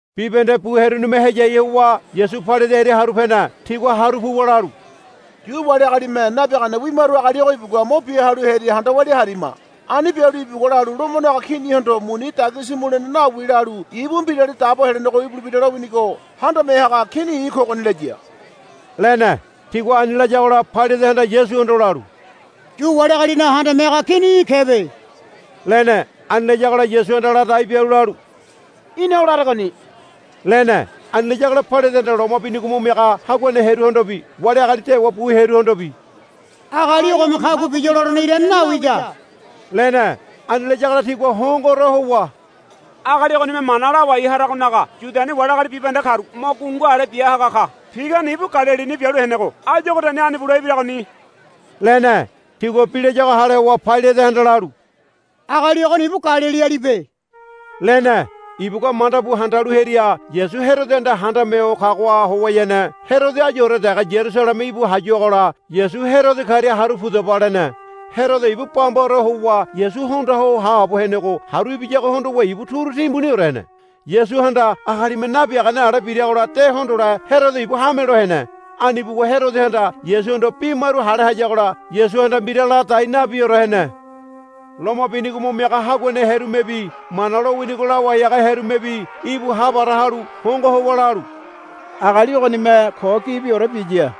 Bibahende bu hearunime heyai howa Yasu Pailate hearia haru pene. Tigua haru puwa lalu, Yu wali agalime nabiagane wimaru agali ogo ibugua mo bia halu hearia handa walia harima. Ani bialu ibugua lalu, Lomonaga Kinihondo muni dagisi mulene nawi, lalu, ibu Mbirali Dabo Helenego ibulebira lowinigo handame haga kini ogoni i̱ kogoni, laya, lene. Tigua ani layagola Pailatehanda Yasuhondo lalu, Yu wali agalinaga handame haga kini í̠ kebe, lene. Ani layagola Yasuhanda ladai bialu lalu, Í̠na o laregoni, lene. Ani layagola Pailatehanda loma binigo mo miaga haguane hearuhondobi wali agali dewa bu hearuhondobi, Agali ogome kagua biya lolene irane nawida, lene. Ani layagola tigua hongoore howa, Agali ogonime mana lawai haragonaga Yudiani wali agali bibahende karu mo gungu ale bia haga ka. Pigane ibu Galilini bialu henego áyu ogoriani ani bule ibiragoni, lene. Tigua bi layago hale howa Pailatehanda lalu, Agali ogoni ibu Galilialibe, lene. Ibugua manda bu handalu hearia Yasu Herodohanda handame ho kagoha howayane Herodo áyure dege Yarusaleme íbu hayuagola, Yasu Herodo karia haru pudaba, lene. Herodo ibu bambaore howa Yasu hondoa ho haabo henego haru ibiyago hondowa ibu turu timbuniore hene. Yasuhanda agalime nabiagane ale biragola de hondole Herodo ibu hamelo hene. Ani buwa Herodohanda Yasuhondo bi maru hale hayagola Yasuhanda mbira ladai nabiore hene. Loma binigo mo miaga haguane hearumebi Mana lowinigo lawai haga hearumebi íbu ha para halu hongo howa lalu, Agali ogonime ko gibiore biya,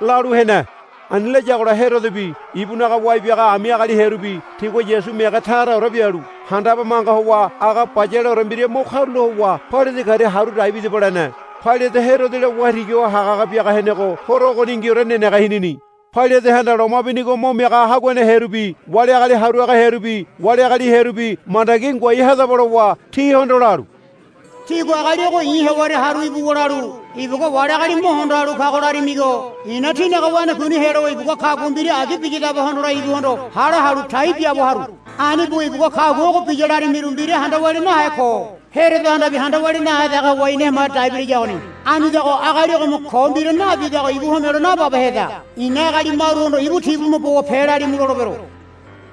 lalu hene. Ani layagola Herodobi ibunaga wai biaga ami agali hearubi tigua Yasu mege taraore bialu handabe manga howa aga bayaleore mbira mo karula howa, Pailate karia haru dai bidaba, lene. Pailate Herodola waitigi ho haga haga biaga henego horo ogoningiore nenege hinini. Pailatehanda loma binigo mo miaga haguane hearubi wali agali haru haga hearubi wali agali hearubi, Mandagi ngoai hadaba, lowa tihondo lalu, Tígua agali ogo i̱ hewaria haru ibuwa lalu, Ibugua wali agali mo hondo halu kago, larimigo i̱na tínaga wanakuini helowa ibugua kagua mbira agi biyadabe hondole ibuhondo hale halu tai biaabo haru. Ani buwa ibugua kagua ogo biya larimiru mbira handa walia nahe ko. Herodohandabi handa walia nahe dege howa ina hemaria dai bilayagoni. Anidago agali ogome ko mbira nabidago ibu homelo nababeheda. I̱na agali maruhondo, Ibu tibume bowa pelalimu, lolebero,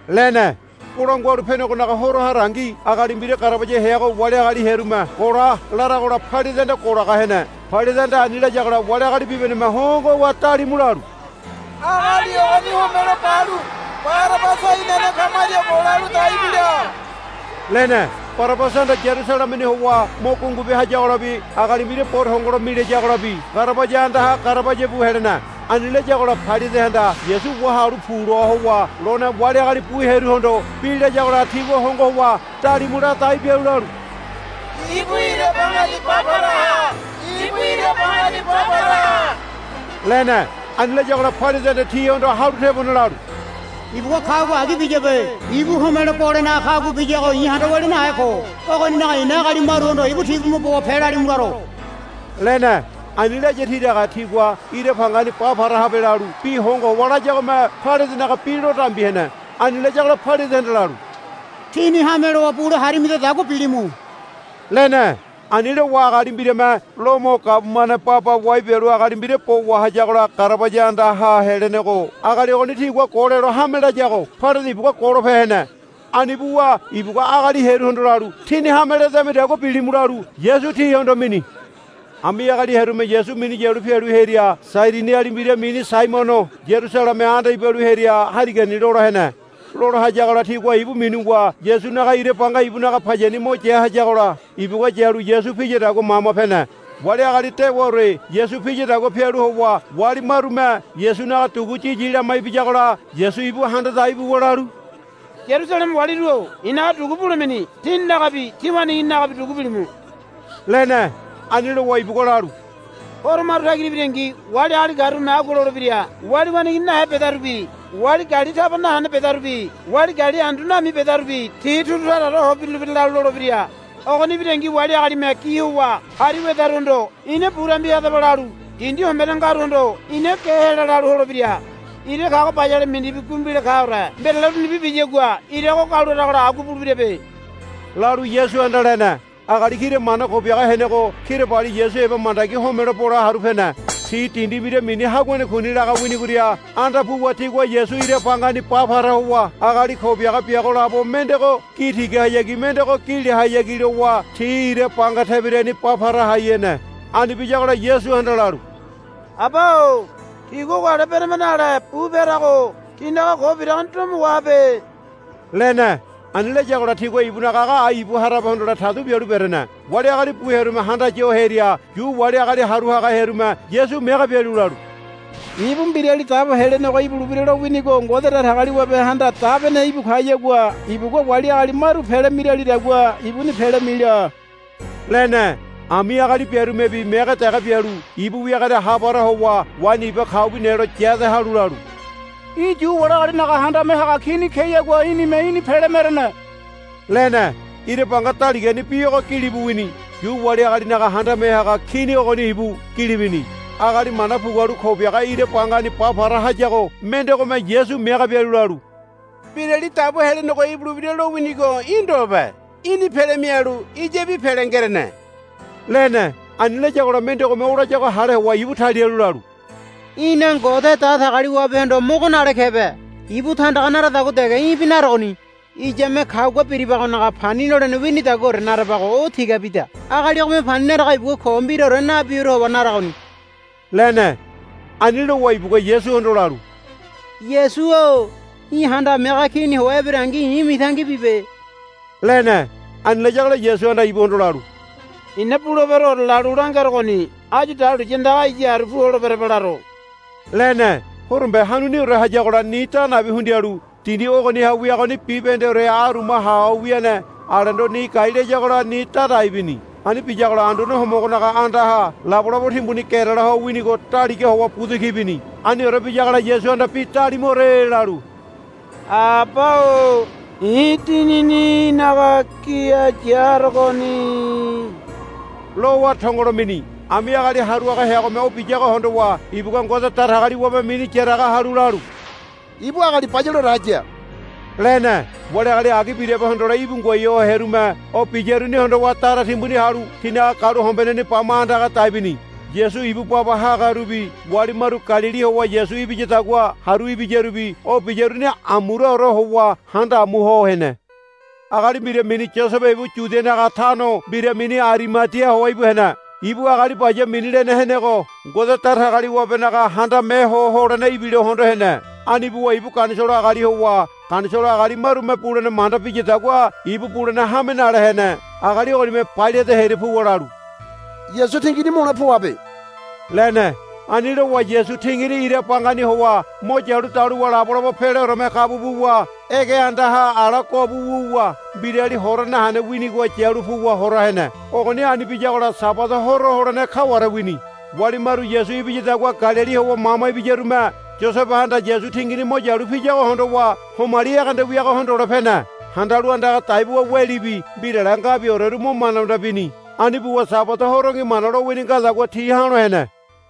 lene. [ Bolangua Halu Penegonaga Horo harangi agali mbira garabaya heago wali agali hearume, Gola, laragola Pailatehanda golaga hene.] Pailatehanda ani layagola wali agali bibahendeme hongo howa dalimu lalu, Agali ogoni homelo balu Barabasa inane kamaria golalu dai bila, lene. Barabasahanda Yarusalemeni howa mo gungu bia hayagolabi agali mbira bo tongolo milayagolabi garabaya andaha garabaya bu helene. Ani layagola Pailatehanda Yasu, Wahalu pu, loa howa lone wali agali bu hearuhondo bi layagola tigua hongo howa dalimu ladai bialu lalu, Ibu ira bangani ba para ha. Ibu ira bangani ba para ha, lene. Ani layagola Pailatehanda tihondo halu tebone lalu, Ibugua kagua agi biyabe. Ibu homelo bolenaga kagua biyago i̱ handa walia nahe ko. Ogoninaga i̱na agali maruhondo, Ibu tibume bowa pelalimu laro, lene. Ani laya tiraga tigua, Ira bangani ba para habe, lalu bi hongo howa layagome Pailatenaga bi lo dambi hene. Ani layagola Pailatehanda lalu, Tíni hame lowa bule harimidadagua bilimu, lene. Ani lowa agali mbirame Lomo gabumane baba wai bialu agali mbira bo wahayagola garabaya andaha helenego agali ogoni tigua golelo hame layago Pailate ibugua golope hene. Ani buwa ibugua agali hearuhondo lalu, Tíni hame ledamidagua bilimu, lalu Yasu tihondo mini. Ami agali hearume Yasu minu yalu pialu hearia Sairiniali mbira mini Saimono Yarusalemeha anda ibalu hearia harigani lola hene. Lola hayagola tigua ibu minuwa Yasunaga ira banga ibunaga payani mo ya hayagola ibugua yalu Yasu piyadagua mama pene. Wali agali dewaore Yasu piyadagua pialu howa wali marume Yasunaga dugu yiyi lama ibiyagola Yasu ibu handa dai buwa lalu, Yarusaleme waliru-o i̱naga dugu bulemini tíninagabi tí waneigininagabi dugu bilimu, lene. Ani lowa ibugua lalu, Horo maru tagira ibirangi wali agali karume agua lolebira, Wali waneigini nahe bedarubi wali gali taba nahene bedarubi wali gali andu nami bedarubi ti turu taraore ho birulebira, lalu lolebira. Ogoni ibirangi wali agalime gi howa hari wedaruhondo, Ina bu dambi hadaba, lalu dindi hombene ngaruhondo, Ina ge hela, lalu holebira. Ira kago bayale mindibi gumbile kaore mbirale urunibi biyagua ira ogo gau laragola agua bulebirabe, lalu Yasuhanda lene. Agali kira mana ko biaga henego kirabali Yasu heba mandagi homelo bole haru pene. Ti dindi mbira mini Haguane Kuni laga winigoria anda puwa tigua Yasu ira bangani ba para howa agali ko biaga biago labo mendego gi tigahayagi mendego gi lehayagi lowa ti ira banga tebirani ba para hai hene. Ani biyagola Yasuhanda lalu, Aba-o tigua ogo ale berama nale bupe harago tinaga ko biragoni domo wahabe, lene. Ani layagola tigua ibunaga aga ai ibu harabe hondole tadu bialu berene. Wali agali bu hearume handaya ho hearia Yu wali agali haru haga hearume Yasu mege bialu lalu, Ibu Mbirali Dabo Helenego ibulebira lowinigo Ngode Datagaliwabehanda dabene ibu kayagua ibugua wali agali maru pele miralidagua ibuni pele mila, lene. Ami agali biarumebi mege dege bialu ibu wiagoria ha para howa waini iba kaubi nelo yade halu lalu, Í̠ Yu wali agalinaga handame haga kini keyagua í̠nime í̠ni pele merene, lene. Ira banga daligani bi ogo gilibu wini. Yu wali agalinaga Handame Haga Kini ogoni ibu, gili bini. Agali mana pugualu ko biaga ira bangani ba para hayago mendegome Yasu mege bialu lalu, Mbirali Dabo Helenego ibulebira lowinigo í̠ ndobe. Í̠ni pele mialu iyabi pele ngerene, lene. Ani layagola mendegome o layago hale howa ibu talialu lalu, Í̠na Ngode Datagaliwabehondo mogo nale kebe. Ibu tandaga naradagua dege í̠bi naregoni. Iyame kagua biribagonaga pani nolene winidaguaore narabago o tigabida. Agali ogome pani narago ibugua ko mbiraore nabiore howa naragoni, lene. Ani lowa ibugua Yasuhondo lalu, Yasu-o í̠ Handame Haga Kini howa eberengi i̱ mitangi bibe, lene. Ani layagola Yasuhanda ibuhondo lalu, I̱na buleberoore lalu langerogoni áyu dahuliya andaga iya haru pu holeberaba laro, lene. Horombe hanuniore hayagola ni da nabi hundialu dindi ogoniha wiagoni bibahendeore aruma haho wiane alendo ni gai layagola ni dadai bini. Ani biyagola Anduane Homogonaga andaha labolabo timbuni gerela ho winigo daliga howa buda ki bini. Aniore biyagola Yasuhanda bi dalimuore lalu, Aba-o i̱ dinini í̠naga gini ya harogoni, lowa tongolo mini. Ami agali haru haga heagome o biyago hondowa ibugua Ngode Datagaliwabe mini yaraga halu lalu, Ibu agali bayaleore haya, lene. Wali agali agi birabe hondole íbu ngoai ho hearume o biyaruni hondowa dara timbuni halu tinaga galuhombeneni bama andaga dai bini. Yasu ibu baba hagarubi wali maru Galili howa Yasu ibiyadagua haru ibiyarubi o biyaruni amuraore howa handa amu ho hene. Agali mbira mini Yosebe ibu Yudianaga tano mbira mini Arimadia howa íbu hene. Ibu agali baya mini lene henego Ngode Datagaliwabenaga Handame Ho Holene ibilo hondo hene. Ani buwa ibu Ganisolo agali howa Ganisolo agali marume bulene manda biyadagua ibu bulene hame nale hene. Agali ogonime Pailate hearia puwa lalu, Yasu tingini mule poaba, lene. Ani lowa Yasu tingini ira bangani howa mo yalu daluwa labolabo peleoreme kabu buwa ege andaha ala guabu wuwa mbirali hora nahene winigoha yalu puwa hora hene. Ogoni ani biyagola Sabada horo holene kaware wini. Wali maru Yasu ibiyadagua Galili howa mama ibiyarume Yosebehanda Yasu tingini mo yalu piyago hondowa homali ege anda wiago hondole pene. Handalu andaga dai buwa welibi mbirale ngabioreru mo manda manda bini. Ani buwa Sabada horongi Mana lowini ngadagua ti ha̱lo hene.